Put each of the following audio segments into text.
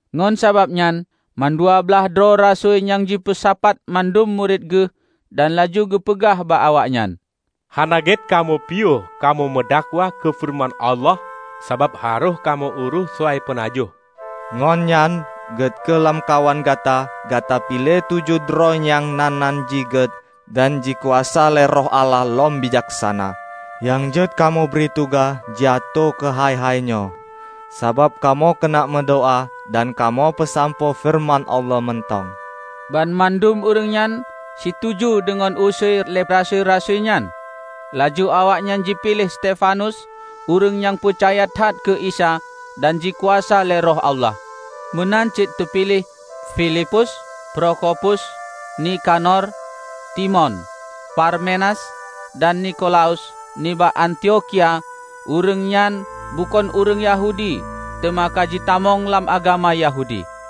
Ngon sabab nyan, mandua blaih droe rasui nyan jipeusapat mandum murit geuh dan laju geupeugah bak awaknyan, "Hana gét kamoe piôh kamoe meudakwah keu feureuman Allah, sabab harôh kamoe urôh soai peunajoh. Ngon nyan, gét kheueh lamkawan gata gata piléh tujoh droe nyang na nan jih gét dan jikuasa lé Roh Allah lom bijaksana, nyang jeuet kamoe bri tugaih jiatoe keuhai-hai nyoe; Sabab kamoe keuneuk meudoá dan kamoe peusampoe feureuman Allah mantong." Banmandum ureuëng nyan situju deungon usui lé rasui-rasui nyan. Laju awaknyan jipiléh Stefanus, ureuëng nyang peucaya that keu Isa dan jikuasa lé Roh Allah. Meunan cit teupiléh: Filipus, Prokhopus, Nikanor, Timon, Parmenas, dan Nikolaus nibak Antiokhia; ureuëng nyan bukon ureuëng Yahudi teuma ka jitamong lam agama Yahudi.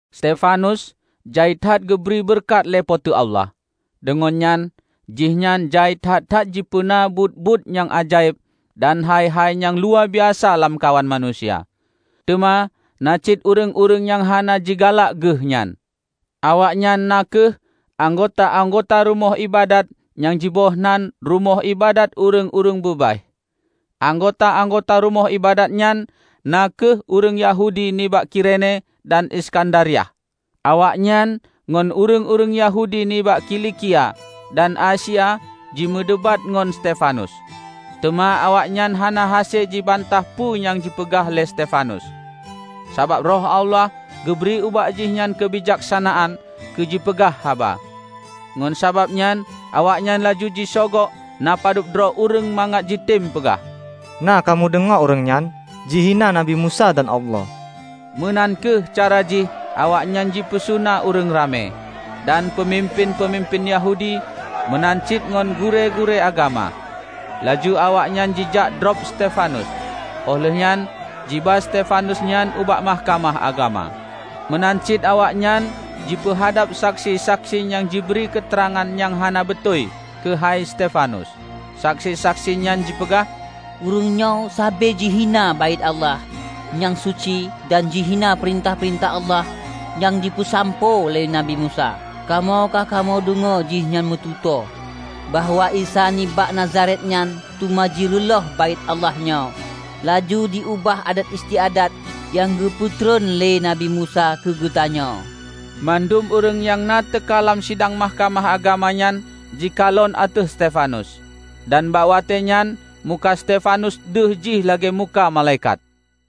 Stefanus jai that geubri beureukat lé Po teu Allah, deungon nyan, jihnyan jai that-that jipeuna buet-buet nyang ajaéb dan hai-hai nyang luwabiasa lamkawan manusia. Teuma na cit ureuëng-ureuëng nyang hana jigalak geuh nyan; awaknyan na kheueh anggota-anggota rumoh iébadat nyang jiboh nan Rumoh Iébadat Ureuëng-ureuëng Beubaih. Anggota-anggota rumoh iébadat nyan na kheueh ureuëng Yahudi nibak Kirene dan Iskandariah. Awaknyan ngon ureuëng-ureuëng Yahudi nibak Kilikia dan Asia jimeudebat ngon Stefanus. Teuma awaknyan hana hase jibantah peue nyang jipeugah lé Stefanus, sabab Roh Allah geubri ubak jihnyan keubijaksanaan keu jipeugah haba. Ngon sabab nyan awaknyan laju jisogok na padub droe ureuëng mangat jitem peugah, "Na kamoe deungoe ureuëng nyan jihina Nabi Musa dan Allah!" Meunan kheueh cara jih awaknyan jipeusuna ureuëng ramé, dan peumimpén-peumimpén Yahudi, meunan cit ngon gurée-gurée agama. Laju awaknyan jijak drob Stefanus, óh lheueh nyan jiba Stefanus nyan ubak Mahkamah Agama. Meunan cit awaknyan jipeuhadab saksi-saksi nyang jibri keuteurangan nyang hana beutôi keuhai Stefanus. Saksi-saksi nyan jipeugah, "Ureuëng nyoe sabe jihina Baét Allah nyang suci dan jihina peurintah-peurintah Allah nyang jipeusampoe lé Nabi Musa. Kamoe ka kamoe deungoe jihnyan meututoe, bahwa Isa nibak Nazaret nyan teuma jireulôh Baét Allah nyoe, laju jiubah adat istiadat nyang geupeutreun lé Nabi Musa keu geutanyoe!" Mandum ureuëng nyang na teuka lam sidang Mahkamah Agama nyan jikalon ateueh Stefanus. Dan bak watée nyan muka Stefanus deuh jih lagée muka malaikat.